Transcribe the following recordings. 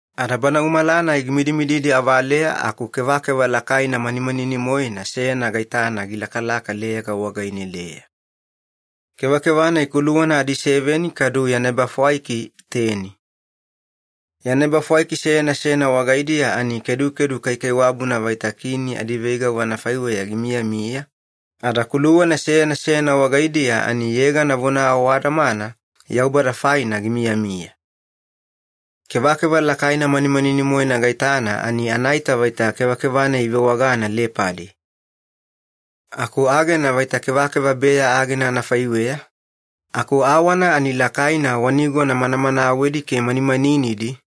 Ada bana umala-nai gimidimididi avaleya aku kevakeva lakaina manimanani-moena seyana gaitana gilakalaka leyaga wagaine-deya. Kevakeva-nai kuluwana adiseveni kadu yana ebafwaiki teni. Yana ebafwaiki seyana seyana wagaidiya ani kedukedu kaikaiwabuna vaita kini adiveigavu anafaiweya gimiyamiya, ada kuluwana seyana seyana wagaidiya ani yegana vona awadamana Yaubada faina gimiyamiya. Kevekeva lakaina manimanini-moena gaitana ani anaita vaita kevakeva-nai ivewagana lepadi. Aku agena vaita kevakeva beya agena anafaiweya, aku awana ani lakaina wa nigona manamanawedi ke manimaninidi,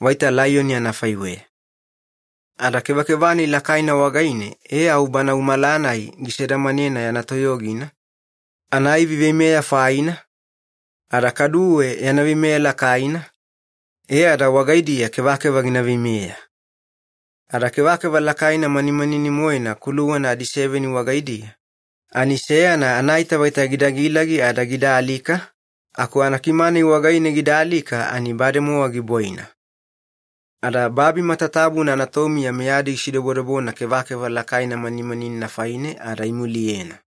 vaita laiyoni anafaiweya. Ada kevakeva-nai lakaina wagaine e au bana umala-nai gisedamanena yana toyogina, anaivi veimeya faina, ada kaduwe yana veimeya lakaina, e ada wagaidiya kevakeva gina veimeya. Ada kevakeva lakaina manimanani-moena kuluwana adiseveni wagaidiya, ani seyana anaita vaita gida gilagi ada gida alika, aku anakima-nai wagaine gida alika ani bademowa gibwaina. Ada babi matatabuna anatomiya meyadi gisidobodobona kevakeva lakaina manimaninina faine ada imuliyena.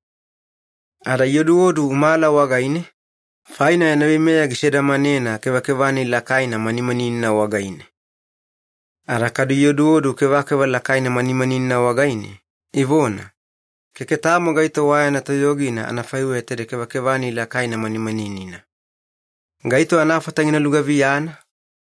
Ada ioduodu umala wagaine, faina yana veimeya gisedamanena kevakeva-nai lakaina manimaninina wagaine. Ada kadu ioduodu kevakeva lakaina manimaninina wagaine, ivona, “Keke tamo gaito wa yana toyogina anafaiweya taide kevakeva-nai lakaina manimaninina. Gaito anafata gina lugaviyana?”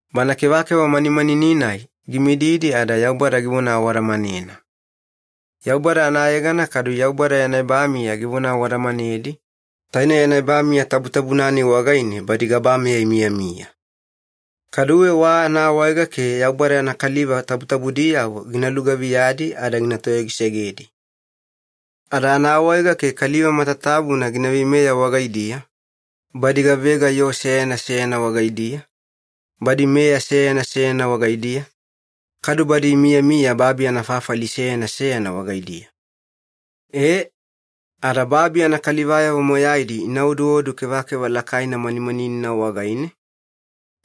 Bana kevakeva manimanini-nai gimididi ada Yaubada givona awadamanena. Yaubada anayegana kadu Yaubada yana ebamiya givona awadamanedi, taine yana ebamiya tabutabuna-nai wagaine badi gabameya imiyamiya. Kaduwe wa anaawaega ke Yaubada yana kaliva tabutabudiyavo gina lugaviyadi ada gina toyogisegedi. Ada anaawaega ke kaliva matatabuna gina veimeya wagaidiya, badi gavega yoo seyana seyana wagaidiya, badi meya seyana seyana wagaidiya, kadu badi imiyamiya babi anafafali seyana seyana wagaidiya. E, ada babi anakalivayavo moyaidi ina oduodu kevakeva lakaina manimaninina wagaine,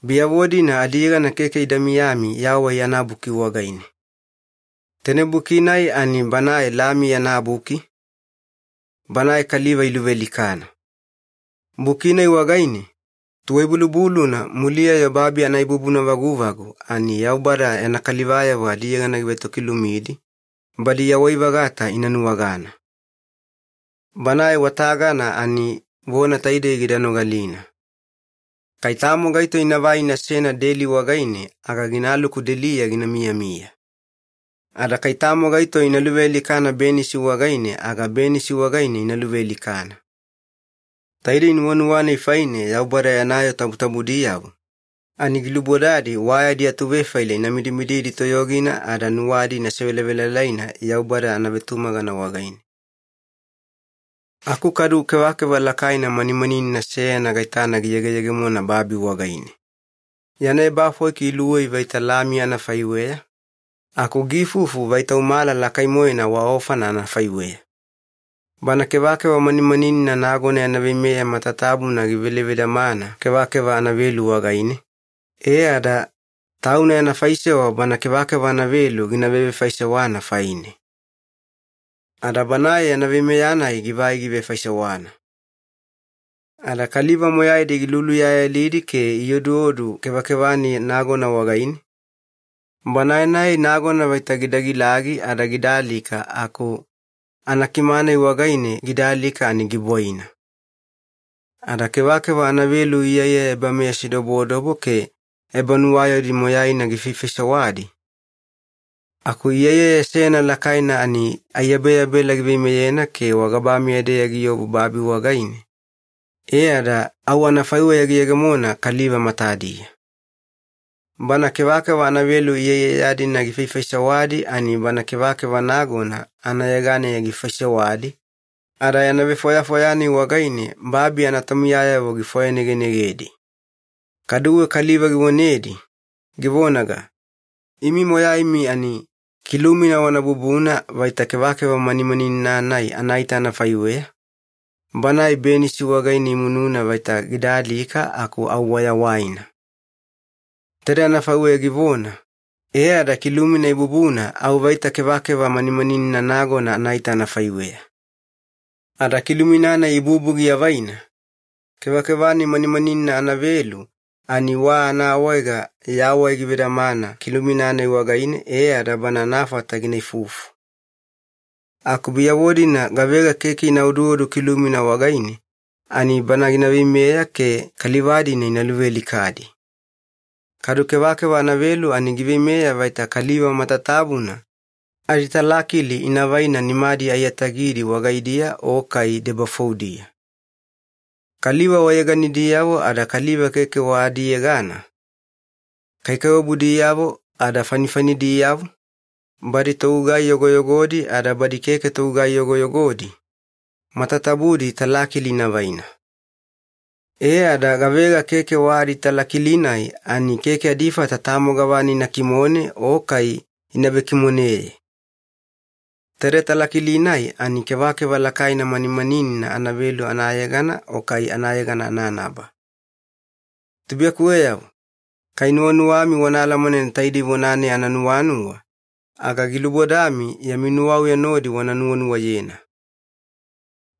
biyavo-dina adiyegana keke ida miyami Yawai anaBuki wagaine. Taine buki-nai ani Banae Lami yana buki, Banae kaliva iluvealikana. Buki-nai wagaine, tuwai-bulubuluna muliya-yo babi anaibubuna vaguvagu, ani Yaubada yana kalivayavo adiyegana givetokilumidi, badi yawai-vagata ina nuwagana. Banae wa tagana ani vona taidei gida nogalina. Kai tamo gaito inavai inasena deli wagaine aga ginaluku deliya gina miyamiya. Ada kai tamo gaito ina luvealikana benisi wagaine aga benisi wagaine ina luvealikana. Taidei nuwanuwa-nai faine Yaubada yana yoo tabutabudiyavo, ani gilubodadi wa yadi atuvefaila ina midimididi toyogina ada nuwadi ina sevelavelalaina Yaubada anavetumagana wagaine. Aku kadu kevakeva lakaina manimaninina seyana gaitana giyegeyegemona babi wagaine. Yana ebafwaiki iluwei vaita lami anafaiweya, aku giifufu vaita umala lakai-moena wa ofana anafaiweya. Bana kevakeva manimaninina nagona yana veimeya matatabuna givele vedamana kevakeva anavelu wagaine, e ada tauna yana faisewa bana kevakeva anavelu gina vevefaisewana faine. Ada banae yana veimeya-nai givai givefaisewana. Ada kaliva moyaidi giluluyayalidi ke ioduodu kevakeva-nai nagona wagaine, banae-nai nagona vaita gida gilagi ada gida alika aku anakima-nai wagaine gida alika ani gibwaina. Ada kevakeva anavelu iyaiyaya ebameyasidobodobo ke ebanuwayaudi moyaina gifaifaisewadi, aku iyaiyaya seyana lakaina ani aiyabeyabela giveimeyena ke wagabameya-deya giobu babi wagaine, e ada au anafaiweya giyegemona kaliva matadiya. Bana kevakeva anavelu iyaiyaya-dina gifaifaisewadi ani bana kevakeva nagona anayeganeya gifaisewadi, ada yana vefwayafwaya-nai wagaine babi anatomiyayavo gifwayanegenegedi. Kaduwe kaliva givonedi, givonaga, “Imi moyaimi ani kilumina wana bubuna vaita kevakeva manimaninina-nai anaita anafaiweya, banae benisi wagaine imununa vaita gida alika aku au wayawaina.” Taide anafaiweya givona, e ada kilumina ibubuna au vaita kevakeva manimaninina nagona anaita anafaiweya. Ada kilumina-nai ibubu giavaina, kevakeva-nai manimaninina anavelu ani wa anaawaega yawai givedamana kilumina-nai wagaine e ada bana anafata gina ifufu. Aku biyavo-dina gavega keke ina oduodu kilumina wagaine, ani bana gina veimeya ke kaliva-dina ina luvealikadi. Kadu kevakeva anavelu ani giveimeya vaita kaliva matatabuna aditalakili ina vaina nimadi aiyatagidi wagaidiya o kai debafoudiya. Kaliva wayeganidiyavo ada kaliva keke wa adiyegana, kaikaiwabudiyavo ada fanifanidiyavo, badi togugai yogoyogodi ada badi keke togugai yogoyogodi, matatabudi talakili ina vaina. E ada gavega keke wa aditalakili-nai ani keke adifata tamo gavana ina kimone o kai ina vekimoneye. Taide talakili-nai ani kevakeva lakaina manimaninina anavelu anayegana o kai anayegana ananaba. Tubuiyakuweyavo, kai nuwanuwami wana alamanena taidei vona-nai ananuwanuwa, aga gilubodami yami nuwauya nodi wana nuwanuwayena.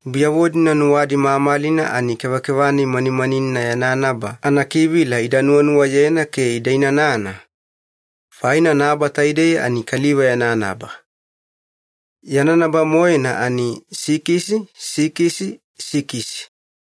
Biyavo-dina nuwadi mamalina ani kevakeva-nai manimaninina yana naba anakivila ida nuwanuwayena ke ida inanana, faina naba taidei ani kaliva yana naba. Yana naba-moena ani sikisi sikisi sikisi.